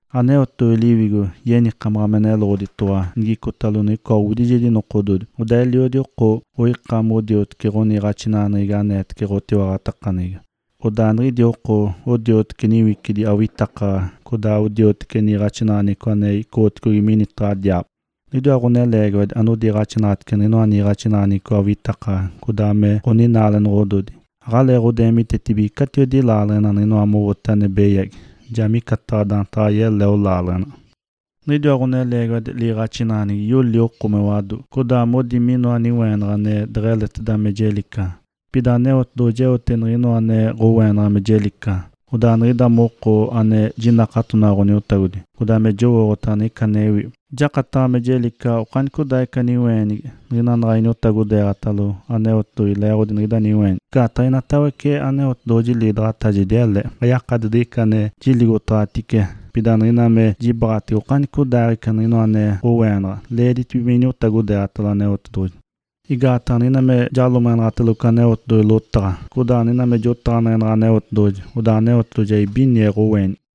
Aneotedoɡ̶oji Liwigo yenikamaɡ̶a me neloɡ̶oditoɡ̶owa nigicotalo niɡ̶icoa owidijedi nokododi, odaa eliodi oko oika modioteci ɡ̶oniiɡ̶axinaɡ̶aneɡ̶egi aneetece ɡ̶otiwaɡ̶atakaneɡ̶egi. Odaa niɡ̶idi oko odioteci niwicidi awitakaɡ̶aɡ̶a, codaa odioteci niiɡ̶axinaɡ̶aneɡ̶eco ane icoɡ̶otedigi minitaɡ̶a diaabo. Niɡ̶idiwa ɡ̶oneleegiwadi anodiiɡ̶axinaɡ̶atece niɡ̶inoa niiɡ̶axinaɡ̶aneɡ̶eco awitakaɡ̶aɡ̶a codaa me ɡ̶oninaalenoɡ̶ododi. Aɡ̶aleeɡ̶odeemitetece catiwedi laaleɡ̶ena niɡ̶ina mowote ane beyagi, ja micataɡ̶a daantaɡ̶a yeleo laaleɡ̶ena. Niɡ̶idiwa ɡ̶oneleegiwadi liiɡ̶axinaɡ̶aneɡ̶egi yoli oko me wado, codaa modi minoa niweenaɡ̶a ane deɡ̶eleteda me jelicaɡ̶a. Pida Aneotedoɡ̶oji eote niɡ̶inoa ane ɡ̶oweenaɡ̶a me jelicaɡ̶a, odaa niɡ̶ida moko ane jinakatonaɡ̶a Ǥoniotagodi, codaa ane jowooɡ̶otaɡ̶a niɡ̶ica anewi, jakataɡ̶a me jelicaɡ̶a okanicodaaɡ̶ica niweenigi, niɡ̶ina naɡ̶a iniotagodeeɡ̶atalo Aneotedoɡ̶oji leeɡ̶odi niɡ̶ida niweenigi. Igaataɡ̶a inoatawece Aneotedoɡ̶oji liidaɡ̶atajedi ele, ayakadi diɡ̶ica ane jiligotaɡ̶atice, pida niɡ̶ina me jibaɡ̶atege okanicodaaɡ̶ica niɡ̶inoa ane ɡ̶oweenaɡ̶a, leeditibige me iniotagodeeɡ̶atalo Aneotedoɡ̶oji. Igaataɡ̶a niɡ̶ina me jalomeɡ̶enaɡ̶atelogo Aneotedoɡ̶oji lotaɡ̶a, codaa niɡ̶ina me jotaɡ̶aneɡ̶enaɡ̶a Aneotedoɡ̶oji, odaa Aneotedoɡ̶oji ja ibinie ɡ̶oweenigi.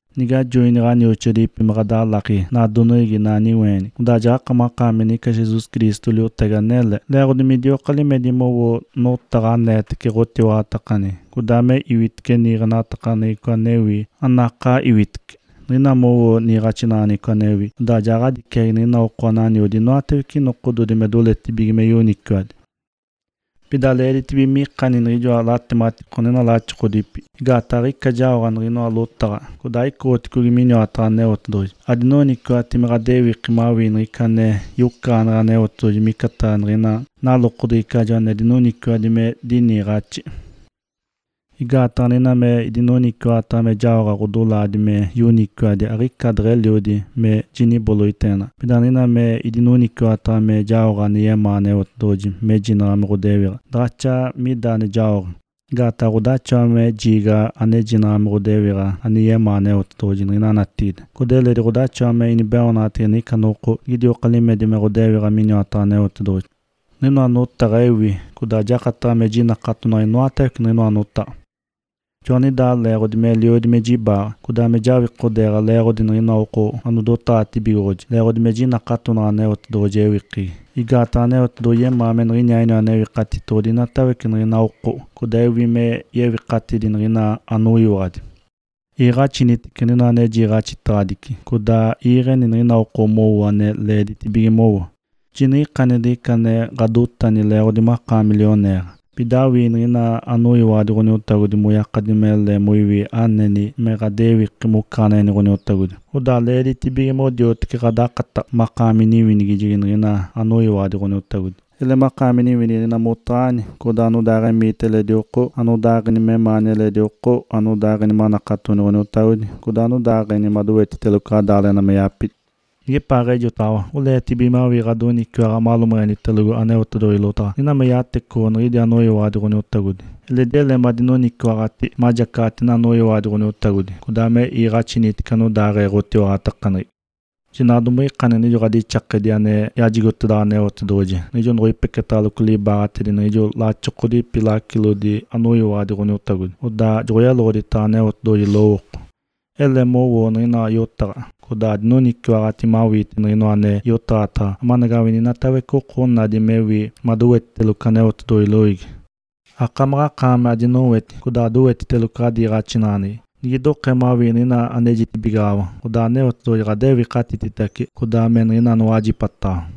Nige ajoini ɡ̶onioxoadipi me ɡ̶adalaki nadoneɡ̶egi inaa niweenigi, odaa jaɡ̶akamaɡ̶akaami niɡ̶ica Jesus Cristo liotagi anele, leeɡ̶odi midioka limedi mowoo notaɡ̶a aneetece ɡ̶otiwaɡ̶atakaneɡ̶egi, codaa me iwitece niiɡ̶axinaɡ̶aneɡ̶eco anewi, anakaa iwitece. Niɡ̶ina mowoo niiɡ̶axinaɡ̶aneɡ̶eco anewi, odaa ja ɡ̶adiciagi niɡ̶ina oko ananiodi inoatawece nokododi me doletibige me yoniciwadi. Pida leeditibige mikani niɡ̶ijoa latematiko niɡ̶ina laxokodipi, igaataɡ̶a aɡ̶ica jaoɡ̶ate niɡ̶inoa lotaɡ̶a, codaa aicoɡ̶otedigi miniwataɡ̶a Aneotedoɡ̶oji. Adinoniciwaɡ̶ati me ɡ̶adewiki mawii niɡ̶ica ane yocaɡ̶aneɡ̶e Aneotedoɡ̶oji micataɡ̶a niɡ̶ina nalokodeɡ̶ecajo ane dinoniciwaɡ̶adi me diniiɡ̶axi. Igaataɡ̶a niɡ̶ina me idinoniciwaɡ̶ataɡ̶a me jaoɡ̶a ɡ̶odolaadi me yoniciwadi aɡ̶ica deɡ̶eliodi me jiniboloiteenaɡ̶a, pida niɡ̶ina me idinoniciwaɡ̶ataɡ̶a me jaoɡ̶a ane yemaa Aneotedoɡ̶oji mejinaɡ̶a me ɡ̶odewiɡ̶a, daɡ̶axa mida ane jaoɡ̶a. Igaataɡ̶a ɡ̶odaxawa me jiigaɡ̶a anejinaɡ̶a me ɡ̶odewiɡ̶a ane yemaa Aneotedoɡ̶oji niɡ̶ina natigide, codaa eledi ɡ̶odaxawa me inibeoonaɡ̶atege niɡ̶ica noko nigidioka limedi me ɡ̶odewiɡ̶a miniwataɡ̶a Aneotedoɡ̶oji. Niɡ̶inoa notaɡ̶a ewi, codaa jakataɡ̶a me jinakatonaɡ̶a inoatawece niɡ̶inoa notaɡ̶a. Joaniɡ̶idaa leeɡ̶odi meliodi me jibaaɡ̶a, codaa me jawikodeeɡ̶a leeɡ̶odi niɡ̶ina oko anodotaɡ̶atibigoɡ̶oji, leeɡ̶odi me jinakatonaɡ̶a Aneotedoɡ̶oji ewikegi. Igaataɡ̶a Aneotedoɡ̶oji yemaa me niɡ̶iniaaɡ̶iniwa Newikatitoɡ̶odi inatawece niɡ̶ina oko, codaa ewi me yewikatidi niɡ̶ina anoyiwaɡ̶adi. Iiɡ̶axinaɡ̶anitece niɡ̶inoa ane jiiɡ̶axitedaɡ̶adici, codaa iiɡ̶eni niɡ̶ina oko mowo ane leeditibige mowo. Jiniɡ̶ikani diɡ̶ica ane ɡ̶adotani leeɡ̶odi makaami lioneeɡ̶a. Pida awii niɡ̶ina anoyiwaɡ̶adi Ǥoniotagodi moyakadi mele moiwi aneni me ɡ̶adewiki mocaɡ̶aneɡ̶eni Ǥoniotagodi, odaa leeditibige modioteci ɡ̶adakataɡ̶a, makaami niwinigijegi niɡ̶ina anoyiwaɡ̶adi Ǥoniotagodi. Ele makaami niwinigijegi niɡ̶ina motaɡ̶ani, codaa anodaaɡ̶emiita eledi oko, anodaaɡ̶eni memaani eledi oko, anodaaɡ̶eni manakatoni Ǥoniotagodi, codaa anodaaɡ̶eni madowetiteloco ɡ̶adaaleɡ̶ena me yapidi. Nigepaaɡ̶ejotaɡ̶awa oleetibige mawii ɡ̶adoniciwaɡ̶a malomeɡ̶enitelogo Aneotedoɡ̶oji lotaɡ̶a niɡ̶ina me yatecoɡ̶o niɡ̶idi anoyiwaɡ̶adi Ǥoniotagodi, eledi ele madinoniciwaɡ̶ati majacaɡ̶ati niɡ̶ina anoyiwaɡ̶adi Ǥoniotagodi, codaa iiɡ̶axinaɡ̶anitece anodaaɡ̶ee ɡ̶otiwaɡ̶atakaneɡ̶egi. Jinaɡ̶a domiɡ̶ikani niɡ̶ijo ɡ̶adixakedi ane yajigotedaɡ̶awa Aneotedoɡ̶oji niɡ̶ijo noɡ̶oipeketaɡ̶aloco libaaɡ̶atedi niɡ̶ijo laxokodipi lacilodi anoyiwaɡ̶adi Ǥoniotagodi, odaa joɡ̶oyeloɡ̶oditaɡ̶awa Aneotedoɡ̶oji lowooko. Ele mowoo niɡ̶inoa yotaɡ̶a, codaa adinoniciwaɡ̶ati mawiite niɡ̶inoa ane yotaɡ̶atedaɡ̶awa amanagawini inatawece oko onadi mewi madowetiteloco Aneotedoɡ̶oji loiigi. Akamaɡ̶akaami adinoweti codaa adowetiteloco ɡ̶adiiɡ̶axinaɡ̶aneɡ̶egi. Nigidokee mawii niɡ̶ina anejitibigaɡ̶awa, odaa Aneotedoɡ̶oji ɡ̶adewikatititace, codaa me niɡ̶ina anowajipataɡ̶awa.